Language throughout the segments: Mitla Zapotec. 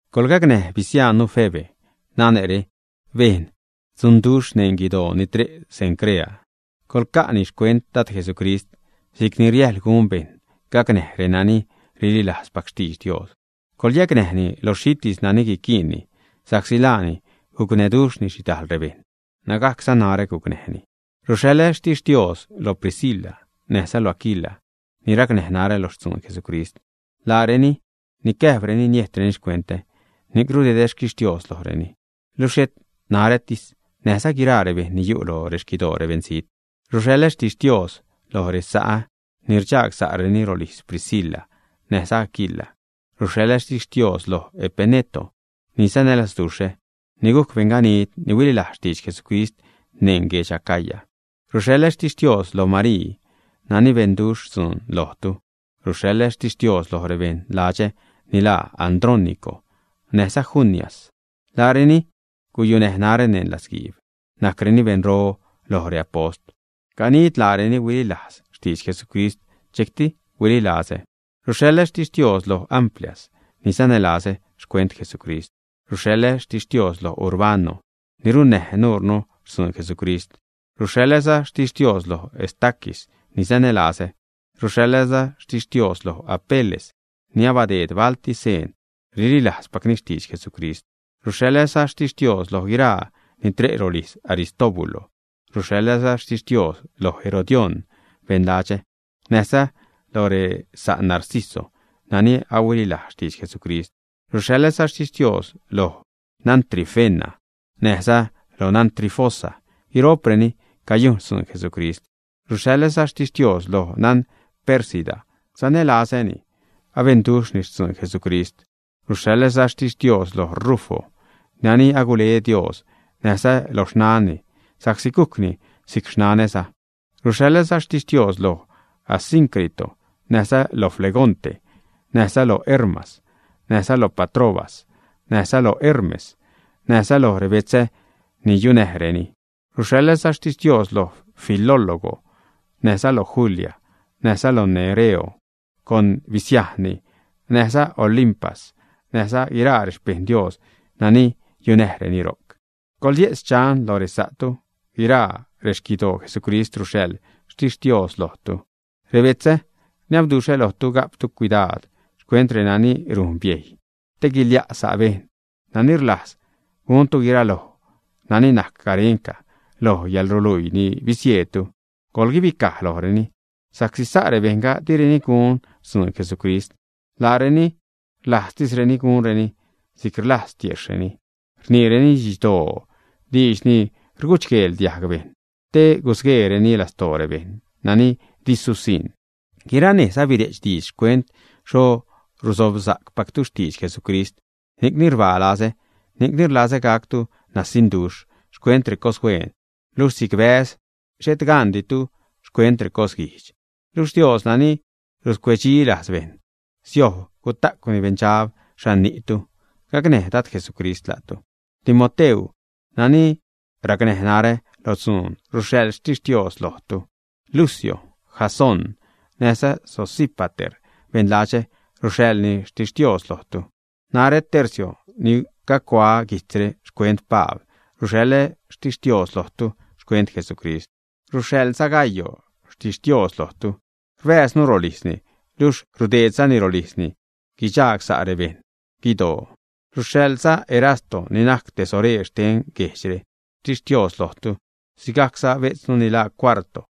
Coḻgacnäj bisiajnnu Febe. Nane're bejn dzunduxh neṉ guidoo ni tre' Cencrea. Coḻca'ni xcuent Dad, Jesucrist, si'cni riäjl gun bejṉ gacnäj renani rililajzpac xtidx Dios. Coḻyacnäjni lo xhitis nani guiquiinni, sa'csi laani gucnäduxhni xhidal rebejṉ, nägajcza narä gucnäjni. Ruxhaḻä xtixtios lo Priscila näjza lo Aquila, ni racnäj narä lo xtzuun Jesucrist. Laareni nicäjpreni niejtreni xcuentä, ni'c rudedä xquixtios lojreni, luxh xhet narätis, näjza guiraa rebejṉ ni yu' lo rexquidoo rebeṉzijt. Ruxhaḻä xtixtios loj resa'ä ni rdxagsa'reni rolijz Priscila näjza Aquila. Ruxhaḻä xtixtios loj Epeneto, ni sanälazduxhä, ni gujc beṉganid ni huililajz xtidx Jesucrist neṉ guedx Acaya. Ruxhaḻä xtixtios lo Marii nani benduxh dzuun lojtu. Ruxhaḻä xtixtios loj rebeṉ ladxä ni laa Andrónico näjza Junias; laareni guyunäj närä neṉ latzguiib, najcreni beṉro loj reapost. Ganid laareni huililajz xtidx Jesucrist, dxejcti huililazä. Ruxhaḻä xtixtios loj Amplias, ni sanälazä xcuent Jesucrist. Ruxhaḻä xtixtios loj Urbano, ni runnäj nuurnu xtzuun Jesucrist. Ruxhaḻäza xtixtios loj Estaquis, ni sanälazä. Ruxhaḻäza xtixtios loj Apeles, ni abadeed balti seen rililajzpacni xtidx Jesucrist. Ruxhaḻäza xtixtios loj guiraa ni tre' rolijz Aristóbulo. Ruxhaḻäza xtixtios lo Herodión beṉ ladxä, näjza loj resa' Narciso nani ahuililajz xtidx Jesucrist. Ruxhaḻäza xtixtios loj nan Trifena näjza nan Trifosa, guiro'preni cayujn xtzuun Jesucrist. Ruxhaḻäza xtixtios loj nan Pérsida, sanälazäni, abenduxhni xtzun Jesucrist. Ruxhaḻäza xtixtios lo Rufo nani agule Dios, näjza lo xnanni, sa'csi gujcni si'c xnanäza. Ruxhaḻäza xtixtios loj Asíncrito, näjza lo Flegonte, näjza lo Hermas, näjza lo Patrobas, näjza lo Hermes, näjza lo rebetzä ni yunäjreni. Ruxhaḻäza xtixtios loj Filólogo, näjza lo Julia, näjza lo Nereo con bisiajnni, näjza lo Olimpas näjza guiraa rexpeṉ Dios nani yunäjreni ro'c. Coḻye'tz xchan loj resa'tu. Guiraa rexquidoo Jesucrist ruxhaḻ xtixtios lojtu. Rebetzä, rniabduxhä lojtu ga'ptu cuidaad xcuent renani rujn biejy te guilia' sa' bejṉ, nani rlajz guntu guiraloj nani najc garenca loj yäḻruluii ni bisieedtu, coḻguibicaj lojreni, sa'csi sa' rebejṉga direni gun xtzuun Jesucrist. Laareni rlajztisreni gunreni si'c rlajz tiejxhreni; rniireni didxdoo, diidx ni rgudxguel diajg bejṉ te rusgueereni lastoo rebejṉ nani di susiṉ. Guiranejz abire'ch diidx xcuent xho rusobsacpactu xtidx Jesucrist, ni'cni rbaa lazä, ni'cni rlazä gactu nasiṉduxh xcuent recoshueen, luxh si'c bäz xhet ganditu xcuent recosguijdx. Luxh Dios nani ruscuecdxilajz bejṉ siojb guta'cwni beṉdxab xhan ni'tu. Gacnäj Dad Jesucrist la'tu. Timoteu nani racnäj narä lo dzuun, ruxhaḻ xtixtios lojtu. Lucio, Jasón, näjza Sosípater, beṉ ladxä, ruxhaḻza xtixtios lojtu. Najrä Tercio, ni cagucuaä guijtzre xcuent Pabl, ruxhaḻäza xtixtios lojtu xcuent Jesucrist. Ruxhaḻza Gayo xtixtios lojtu. Rbääznu rolijzni, luxh rudeedzani rolijzni guidxagsa' rebeṉ guidoo. Ruxhaḻza Erasto, ni najc tesoreer xten guejdxre, xtixtios lojtu, sigajcza bejtznu ni laa Cuarto.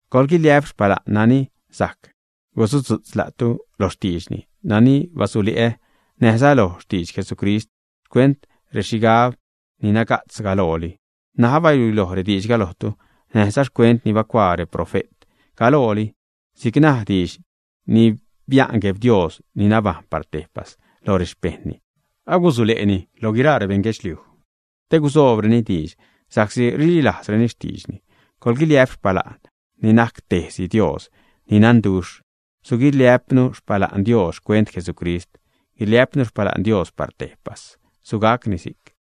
Coḻguiliä'p xpala'n nani sajc gusudzu'tz la'tu loj xtiidxni nani basule'ä, näjza loj xtidx Jesucrist xcuent rexhigab ni naga'tz galooli, ṉaj abaluiloj rediidxga lojtu; näjza xcuent ni bacuaa reprofe't galooli; si'c najc diidx ni bia'n Gueb Dios ni nabajṉ par tejpas loj rexpejṉni, agusule'ni loj guiraa rebeṉ guedxliuj, te gusoobreni diidx sa'csi rililajzreni xtiidxni, coḻguiliä'p xpala'n ni najc tejtis Dios ni nanduxh. Suguiliä'pnu xpala'n Dios xcuent Jesucrist. Guiliä'pnu xpala'n Dios par tejpas. Sugacni si'c.